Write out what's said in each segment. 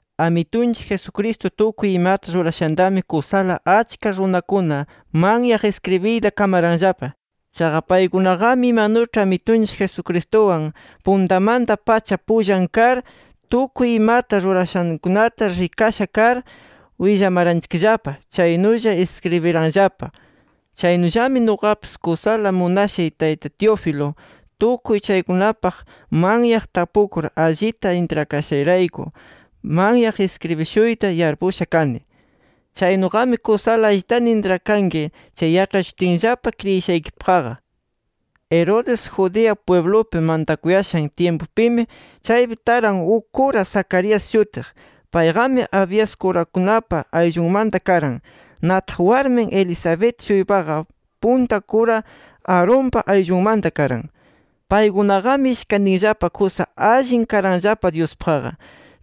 Amitunchik Jesucristo tukuy imata rurashantami kusala achka runakuna manyaq iskribiyta kamaranllapa. Chaqa paykunaqami imanuĉhi Amitunchik Jesucristuwan puntamanta-pacha pullan kar, tukuy imata rurashankunata rikasha kar willamaranchikllapa chaynulla iskribiranllapa. Chaynullami nuqapis kusala munashay Tayta Teófilo tukuy chaykunapaq manyaq tapukur allita intrakashayrayku manyaq iskribishuyta yarpusha kani. Chaynuqami kusala allitana intrakanki chay yaĉhachishutinllapa kriyishaykipaqqa. Herodes Judea pwiblupi mantakuyashan tyimpupimi, chaypi taran uk kura Zacarías shutiq. Payqami, Abías kurakunapa ayllunmanta karan. Nataq, warmin Elisabet-shuypaqa punta kura Aaronpa ayllunmanta karan. Paykunaqami ishkantinllapa kusa allin karanllapa Dyuspaqqa.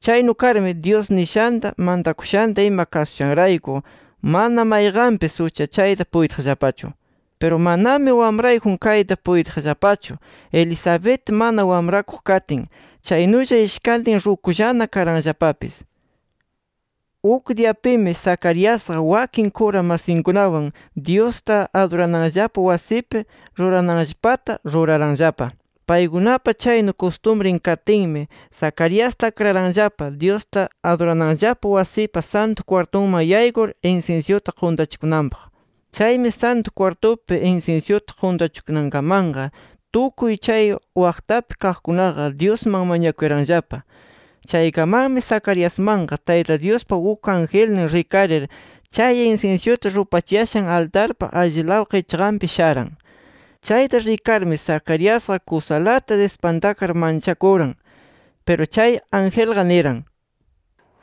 Chaynu karmi, Dyus nishanta, mantakushanta ima kasushanrayku mana mayqanpis uchachayta puytiqllapachu. Piru manami wamrayjun kayta puytiqllapachu, Elisabet mana wamrakuq katin. Chaynulla ishkantin rukullana karanllapapis. Uk diyapimi, Zacariasqa wakin kura masinkunawan Dyusta adurananllapa wasipi rurananllapata ruraranllapa. Paykunapa chaynu kustumrin katinmi, Zacariasta akraranllapa Dyusta adurananllapa wasipa Santu Kwartunman yaykur, insinsyuta quntachikunanpaq. Chaymi, Santu Kwartupi insinsyuta quntachikunankamanqa, tukuy chay waqtapi kaqkunaqa Dyusman mañakuyaranllapa. Chaykamanmi Zacariasmanqa, Tayta Dyuspa uk angelnin rikarir, chay insinsyuta rupachiyashan altarpa allilaw qichqanpi sharan. Chayta rikarmi Zacariasqa kusalata dispantakar manchakuran. Piru chay angelqa niran: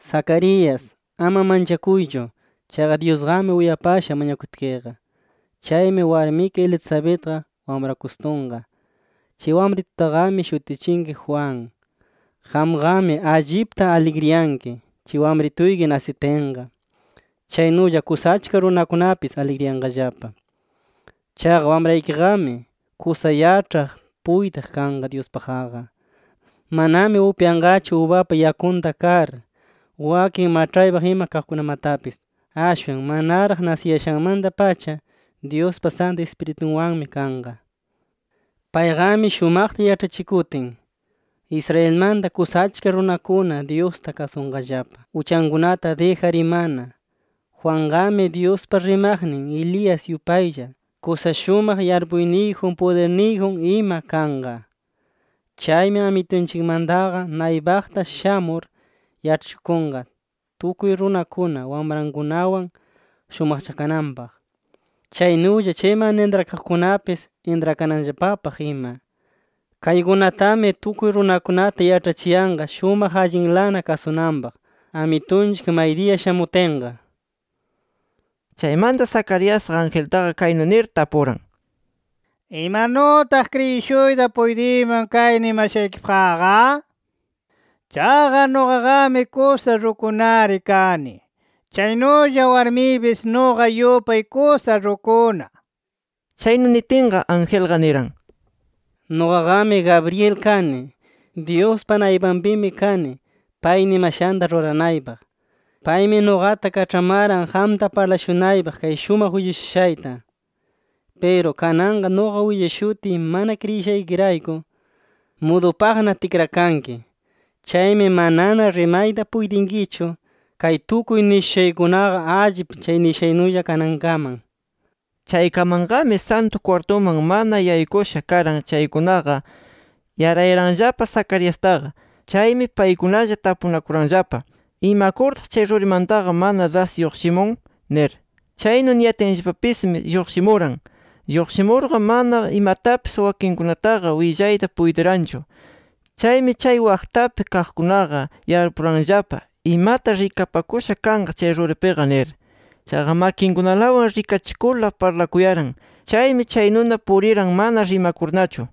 —Zacarías, ama manchakuychu. Chaqa Dyusqami uyapasha mañakutkiqa. Chaymi, warmiki Elisabetqa wamrakustunqa. Chay wamritutaqami shutichinki Juan. Qamqami allipta aligriyanki, chay wamrituyki nasitinqa. Chaynulla kusa achka runakunapis aligriyanqallapa. Chaqa wamraykiqami, kusa yaĉhaq puytiq kanqa Dyuspaqqa. Manami upyanqachu ubapa yakunta kar, wakin maĉhaypaq ima kaqkunamatapis. Ashwan manaraq nasiyashanmanta-pacha, Dyuspa Santu Ispiritunwanmi kanqa. Payqami shumaqta yaĉhachikutin, Israelmanta kusa achka runakuna Dyusta kasunqallapa, uchankunata dijar imana. Juanqami, Dyuspa rimaqnin Elías yupaylla, kusa shumaq yarpuyniyjun, pudirniyjun ima kanqa. Chaymi, Amitunchikmantaqa naypaqta shamur yaĉhachikunqa, tukuy runakuna wamrankunawan shumaqchakananpaq, chaynulla chay mana intrakanaqkunapis intrakananllapapaq ima. Kaykunatami, tukuy runakunata yaĉhachiyanqa shumaq allinlana kasunanpaq, Amitunchik maydiya shamutinqa. Chaymanta Zacariasqa, angeltaqa kaynu nir tapuran: —¿Imanutaq kriyishuyta puytiyman kay nimashaykipaqqa? Chaqa nuqaqami kusa rukunari kani, chaynulla warmiypis nuqa yupay kusa rukuna. Chaynu nitinqa, angelqa niran: —Nuqaqami Gabriel kani. Dyuspa naypanpimi kani pay nimashanta ruranaypaq. Paymi nuqata kaĉhamaran qamta parlashunaypaq kay shumaq willashushayta. Piru kananqa, nuqa willashutiy mana kriyishaykirayku, mudupaqna tikrakanki. Chaymi manana rimayta puytinkichu, kay tukuy nishushaykunaqa allip chay nishaynulla kanankaman. Chaykamanqami, Santu Kwartuman mana yaykusha karan chaykunaqa, yarayaranllapa Zacariastaqa. Chaymi paykunalla tapunakuranllapa: “¿Imakurtaq chay rurimantaqa mana das lluqshimun?” nir. Chaynu niyatinllapapismi, lluqshimuran. Lluqshimurqa, mana imatapis wakinninkunataqa willayta puytiranchu. Chaymi chay waqtapi kaqkunaqa yarpuranllapa, imata rikapakusha kanqa chay ruripiqa nir. Chaqa makinkunalawan rikachikurla parlakuyaran. Chaymi, chaynuna puriran mana rimakurnachu.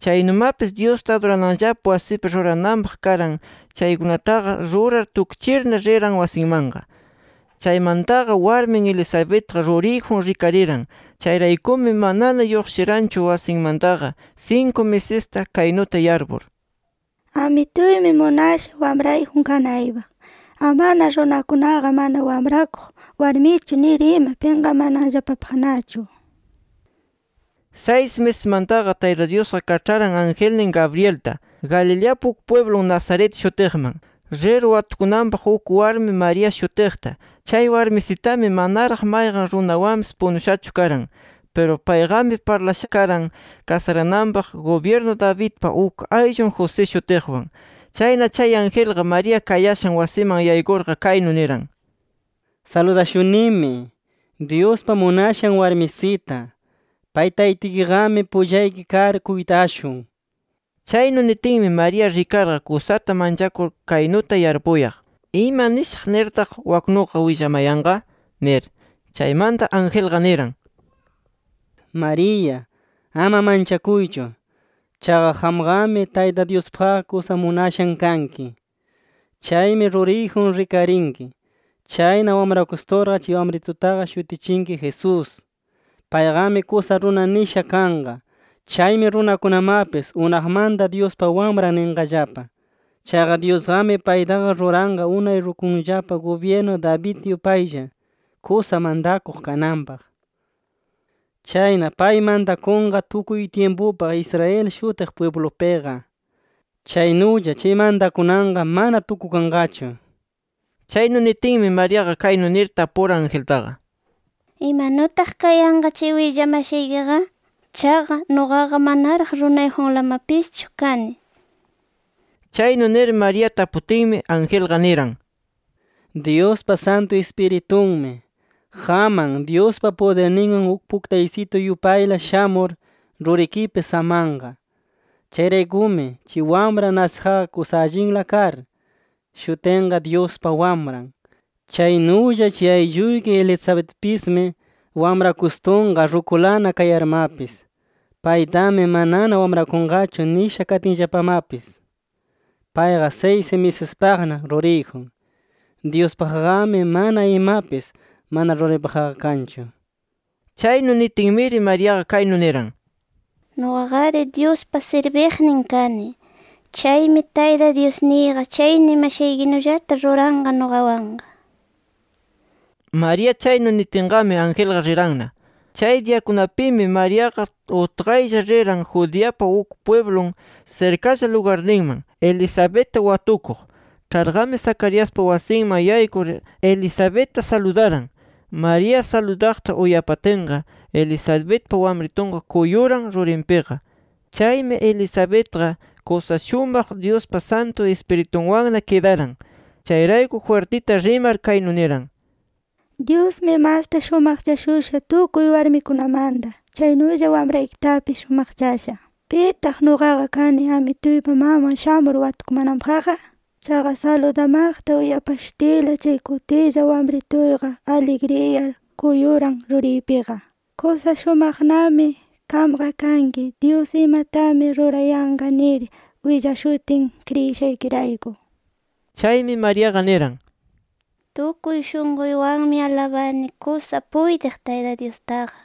Chaynumapis, Dyusta adurananllapa wasipi rurananpaq karan chaykunataqa rurar tukchirna, riran wasinmanqa. Chaymantaqa, warmin Elisabetqa ruriyjun rikariran. Chayraykumi, manana lluqshiranchu wasinmantaqa sinku misista, kaynuta yarpur: “Amituymi munasha wamrayjun kanaypaq, amana runakunaqa, mana wamrakuq warmichu nir ima pinqamananllapapaqnachu”. Saysi misismantaqa, Tayta Dyusqa kaĉharan angelnin Gabrielta, Galileapa uk pwiblun Nazaret shutiqman, rir watukunanpaq, uk warmi María shutiqta. Chay warmisitami manaraq mayqan runawanpis punushachu karan. Piru payqami, parlashana karan kasarananpaq, gubyirnu Davidpa uk ayllun José shutiqwan. Chayna, chay angelqa María kayashan wasiman yaykurqa, kaynu niran: —Saludashunimi, Dyuspa munashan warmisita, pay Taytituykiqami pullayki kar kuytashun. Chaynu nitinmi, María rikarqa kusata manchakur kaynuta yarpuyaq: ¿Ima nishaq nirtaq waknuqa willamayanqa? nir. Chaymanta angelqa niran: —María, ama manchakuychu. Chaqa qamqami Tayta Dyuspaqqa kusa munashan kanki. Chaymi, ruriyjun rikarinki. Chayna wamrakusturqa, chay wamritutaqa shutichinki Jesús. Payqami kusa runa nisha kanqa. Chaymi runakunamapis Unaqmanta Dyuspa Wamran ninqallapa. Chaqa Dyusqami, paytaqa ruranqa unay rukunllapa gubyirnu David yupaylla kusa mantakuq kananpaq. Chayna pay mantakunqa tukuy tyimpupaq Israel shutiq pwiblupiqa. Chaynulla chay mantakunanqa, mana tukukanqachu. Chaynu nitinmi, Mariaqa kaynu nir tapuran angeltaqa: —¿Imanutaq kayanqa chay willamashaykiqa? Chaqa, nuqaqa manaraq runayjunlamapischu kani. Chaynu nir María taputinmi, angelqa niran: —Dyuspa Santu Ispiritunmi, qamman Dyuspa pudirninwan uk puktaysitu yupayla shamur, rurikipi samanqa. Chayraykumi, chay wamran nasiqqa kusa allinla kar, shutinqa Dyuspa Wamran. Chaynulla, chay aylluyki Elisabetpismi, wamrakustunqa rukulana kayarmapis. Paytami manana wamrakunqachu nisha katinllapamapis, payqa saysi misispaqna ruriyjun. Dyuspaqqami mana imapis, mana ruraypaqqa kanchu. Chaynu nitinmiri, Mariaqa kaynu niran: —Nuqaqari Dyuspa sirbiqnin kani. Chaymi, Tayta Dyusniyqa chay nimashaykinullata ruranqa nuqawanqa. María chaynu nitinqami, angelqa riranna. Chay diyakunapimi, Mariaqa utqaylla riran, Judeapa uk pwiblun sirkalla lugarninman, Elisabetta watukuq. Ĉharqami, Zacariaspa wasinman yaykur Elisabetta saludaran. María saludaqta uyapatinqa, Elisabetpa wamritunqa kuyukuran rurinpiqa. Chaymi, Elisabetqa kusa shumaq Dyuspa Santu Ispiritunwanna kidaran. Chayrayku, jwirtita rimar, kaynu niran: —Dyusmi masta shumaqchashusha tukuy warmikunamanta. Chaynulla, wamraykitapis shumaqchasha. ¿Pitaq nuqaqa kani, Amituypa maman shamur watukumananpaqqa? Chaqa, saludamaqta uyapashutiyla, chay kutilla wamrituyqa aligriyar kuyuran ruriypiqa. Kusa shumaqnami qamqa kanki, Dyus imatami rurayanqa nir willashutin kriyishaykirayku. Chaymi, Mariaqa niran: “Tukuy shunquywanmi alabani kusa puytiq Tayta Dyustaqa.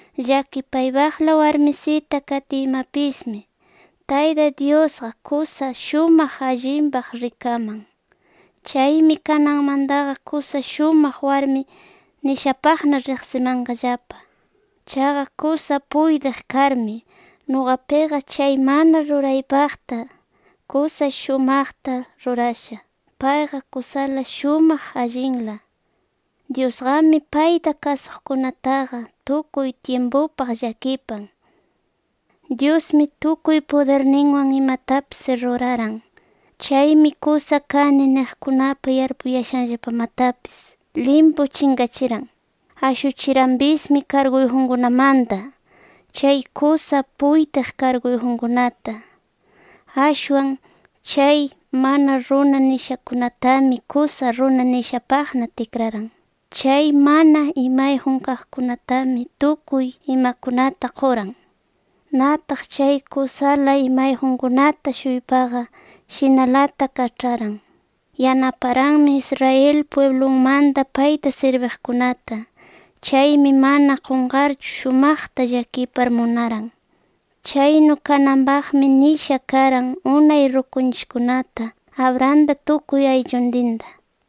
Llakipaypaqla warmisita katiymapismi, Tayta Dyusqa kusa shumaq allinpaq rikaman. Chaymi, kananmantaqa kusa shumaq warmi nishapaqna riqsimanqallapa. Chaqa, kusa puytiq karmi, nuqapiqa chay mana ruraypaqta kusa shumaqta rurasha. Payqa kusala shumaq allinla. Dyusqami payta kasuqkunataqa, tukuy tyimpupaq llakipan. Dyusmi, tukuy pudirninwan imatapis ruraran. Chaymi kusa kani niqkunapa yarpuyashanllapamatapis limpu chinqachiran. Ashuchiranpismi kargunkunamanta, chay kusa puytiq karguyjunkunata. Ashwan, chay mana runa nishakunatami, kusa runa nishapaqna tikraran. Chay mana imayjun kaqkunatami, tukuy imakunata quran. Nataq chay kusala imayjunkunata-shuypaqa, shinalata kaĉharan. Yanaparanmi Israel pwiblunmanta payta sirbiqkunata. Chaymi mana qunqarchu, shumaqta llakipar munaran. Chaynu kananpaqmi nisha karan unay rukunchikkunata, Abrahamta tukuy aylluntinta”.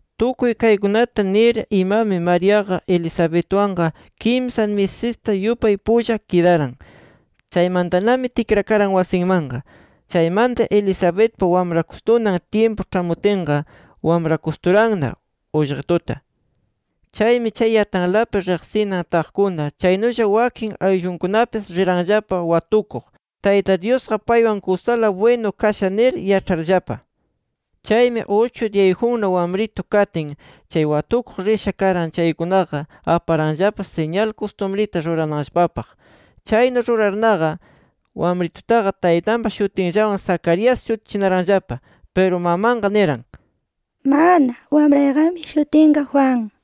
Tukuy kaykunata nir imami, Mariaqa Elisabetwanqa kimsa misista yupay pulla kidaran. Chaymantanami tikrakaran wasinmanqa. Chaymanta, Elisabetpa wamrakustunan tyimpu ĉhamutinqa, wamrakusturanna ullqituta. Chaymi, chay yatanlapi riqsinan taqkuna, chaynulla wakin ayllunkunapis, riranllapa watukuq, Tayta Dyusqa paywan kusala bwinu kasha nir yaĉharllapa. Chaymi uchu diyayjunna wamritu katin, chay watukuq risha karan chaykunaqa, aparanllapa siñal kustumrita rurananllapapaq. Chaynu rurarnaqa, wamritutaqa taytanpa shutinllawan Zacarías, shutichinaranllapa. Piru mamanqa niran: —¡Mana! Wamrayqami shutinqa Juan.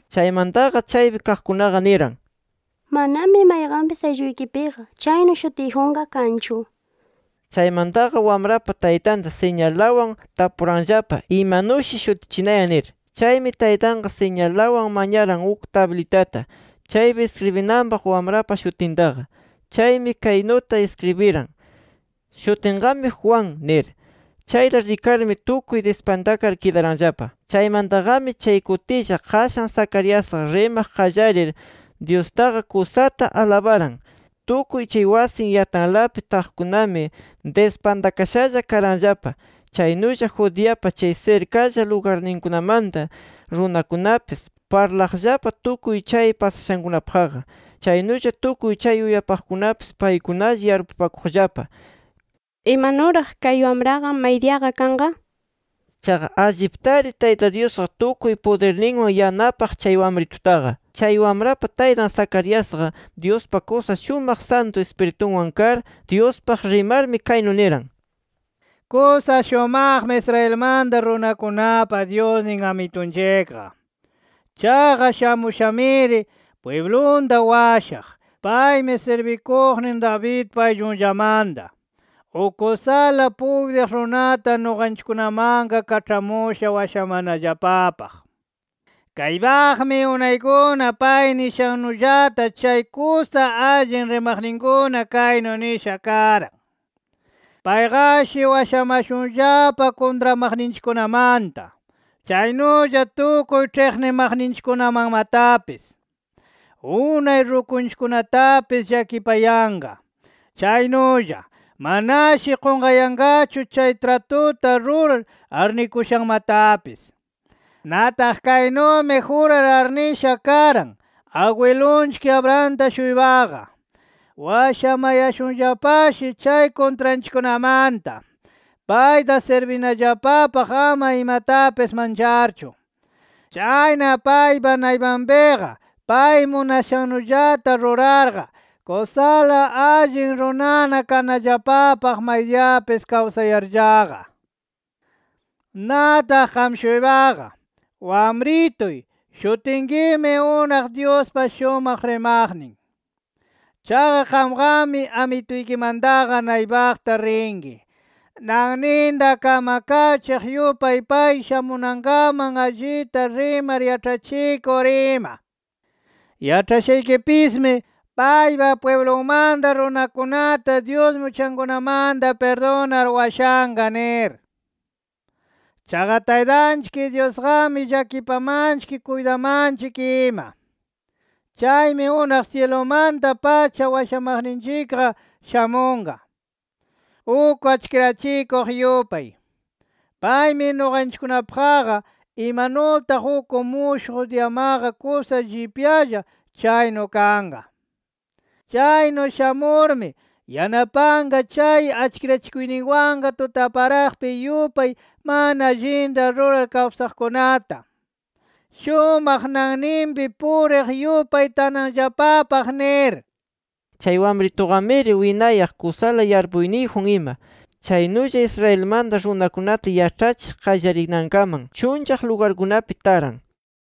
Chaymantaqa, chaypi kaqkunaqa niran: —Manami mayqanpis aylluykipiqa, chaynu shutiyjunqa kanchu. Chaymantaqa, wamrapa taytanta siñalawan tapuranllapa, imanushi shutichinayan nir. Chaymi, taytanqa siñalawan mañaran uk tablitata, chaypi iskribinanpaq wamrapa shutintaqa. Chaymi kaynuta iskribiran: “Shutinqami, Juan” nir. Chayta rikarmi tukuy dispantakar kidaranllapa. Chaymantaqami, chay kutilla qashan Zacariasqa rimaq qallarir Dyustaqa kusata alabaran. Tukuy chay wasin yatanlapi taqkunami, dispantakashalla karanllapa. Chaynulla, Judeapa chay sirkalla lugarninkunamanta runakunapis, parlaqllapa tukuy chay pasashankunapaqqa. Chaynulla, tukuy chay uyapaqkunapis paykunalla yarpupakuqllapa: “¿Imanuraq kay wamraqa maydiyaqa kanqa?” nir. Chaqa alliptari Tayta Dyusqa tukuy pudirninwan yanapaq chay wamritutaqa. Chay, wamrapa taytan Zacariasqa, Dyuspa kusa shumaq Santu Ispiritunwan kar, Dyuspaq rimarmi kaynu niran: “Kusa shumaqmi Israelmanta runakunapa Dyusnin, Amitunchikqa. Chaqa, shamushamiri pwiblunta washaq. Paymi, sirbikuqnin Davidpa ayllunllamanta, uk kusala puytiq runata nuqanchikkunamanqa kaĉhamusha washamanallapapaq. Kaypaqmi unaykuna pay nishannullata, chay kusa allin rimaqninkuna kaynu nisha karan: Payqashi washamashunllapa, kuntramaqninchikkunamanta, chaynulla tukuy ĉhiqnimaqninchikkunamanmatapis. Unay rukunchikkunatapis, llakipayanqa. Chaynulla, manashi qunqayanqachu chay tratuta rurar arnikushanmatapis. Nataq, kaynumi jurar arnisha karan, agwilunchik Abrahamta-shuypaqa. Washamayashunllapashi, chay kuntranchikkunamanta, payta sirbinallapapaq ama imatapis mancharchu. Chayna paypa naypanpiqa, pay munashannullata rurarqa, kusala allin runana kanallapapaq, maydiyapis kawsayarllaqa. Nataq qam-shuypaqa, wamrituy, shutinkimi unaq Dyuspa shumaq rimaqnin. Chaqa, qamqami Amituykimantaqa naypaqta rinki, nanninta kamkachiq yupay pay shamunankaman allita rimar yaĉhachikur ima. Yaĉhachinkipismi, paypa pwiblunmanta runakunata Dyusmi uchankunamanta pirdunar washanqa nir. Chaqa Taytanchik Dyusqami, llakipamanchik kuytamanchik ima. Chaymi unaq syilumanta-pacha washamaqninchikqa shamunqa, uk achkirachikuq yupay. Paymi nuqanchikkunapaqqa, imanutaq uk mushuq diyamaqa kusa llipyalla, chaynu kanqa. Chaynu shamurmi, yanapanqa chay achkirachikuyninwanqa tutaparaqpi yupay mana allinta rurar kawsaqkunata, shumaq nanninpi puriq yupay tanallapapaq” nir. Chay wamrituqamiri winayaq, kusala yarpuyniyjun ima. Chaynulla, Israelmanta runakunata yaĉhachiq qallarinankaman, chunllaq lugarkunapi taran.